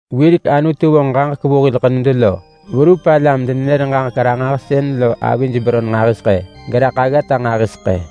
Wirek Anutu vonġ ġaġek vu hil ḳenud lo verup alam-denenër-ġaġek-ranġahsën lo avij beron nġahiseḳë, geraḳ aggata nġahiseḳë.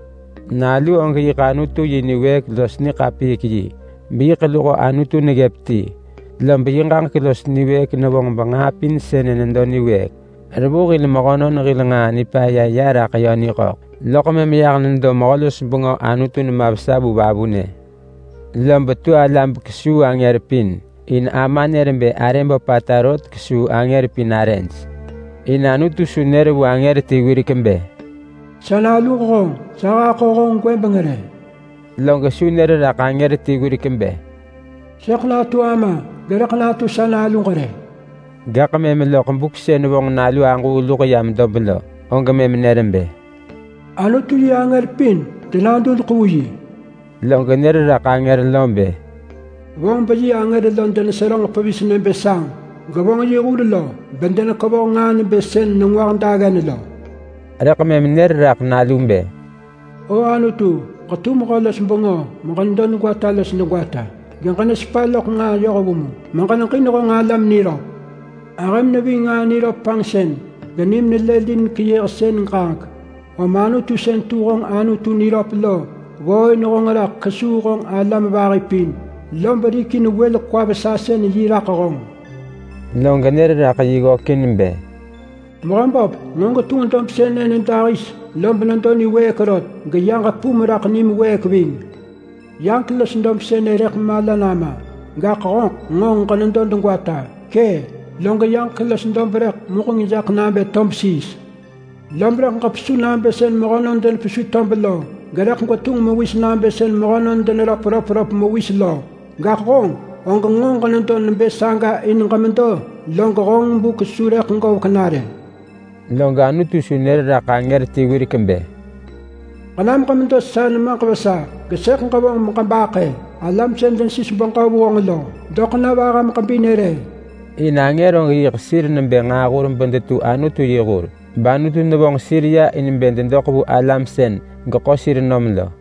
Nalu og yiḳ Anutu yi niwëëk los niḳapiik yi, beyiḳ luho Anutu neggëp ti. Lob yi ġaġek los niwëëk nevonġ benġaa pin sënë nedo niwëëk. Revu hil mehönon hil nġaa nipaya ya raḳ yö niḳöḳ, loḳ mëm yah nedo Mehö-los-bengö Anutu nema vesa vu vavunë. Lob tu ala bekesuu angër pin, in Ama nër bë arë böpata rot kesuu angër pin arëj. In Anutu su nër vu angër ti wirek bë: “Sa naluġ honġ. Sa haḳo honġ gwëbeng” rë. Log su nër raḳ angër ti wirek bë: “Sëḳ natu Ama, gerëḳ natu sa Naluġ” rë. Gaḳ mëm loḳ buk sën vonġ Nalu Aġuu luḳ yam dob lo, og mëm nër bë: “Anutu yi angër pin denadudeḳ vu yi.” Log nër raḳ angër lo bë: “Vonġ beyi angër lo deneseröġ pevis nebë sanġ. Gevonġ yi hur lo bedenekevoh nġaa nebë sën nengwah daggen lo.” Rëḳ mëm nër raḳ Nalu bë: “O Anutu, ġetu mehö-los-bengö meġenedo degwata los degwata. Geġenesepa loḳ nġaa yohvu mu meġeneġin honġ alam niröp. Ahëm neving nġaa niröp panġsën, genim nelëlin keyëhsën ġaġek. Om Anutu sën tu honġ Anutu niröp lo ggooin honġ raḳ kesuu honġ alam vahi pin, lob rikin wël kwa-vesasën-yi raḳ honġ.” Log nër raḳ yi ggökin bë: “Mehöböp, nġo ġetunġ dob sënë nyëdahis, lob nedo niwëëk rot. Geyaġek pum raḳ nim wëëk ving. Yaġek los dob sënë rëḳ mala nama, gaḳ honġeḳ nġo ġenedo degwata. Kë, log yaġek los dob rëḳ muġeng jaḳ nabë tob siis. Lob rëḳ ġepesu nabë sën mehönon denepesu tob lo, gerëḳ gwetunġ mewis nabë sën mehönon deneröp röpröp mewis lo. Gaḳ honġ, og nġo ġenedo nebë saga in ġemedo, log honġ buk su rëḳ govek na rë.” Log Anutu su nër raḳ angër ti wirek bë: “Ġenam ġemedo sa nemaġ vesa, gesëḳ ġevonġ beġebaḳë alam sën denesis beġö vu honġ lo doḳ na vaham ġebinë” re. In angër og yiḳ sir nebë nġaahur bedetu Anutu yi hur, bAnutu nevonġ sir ya in bë dedoḳ vu alam sën geḳo sir nom lo.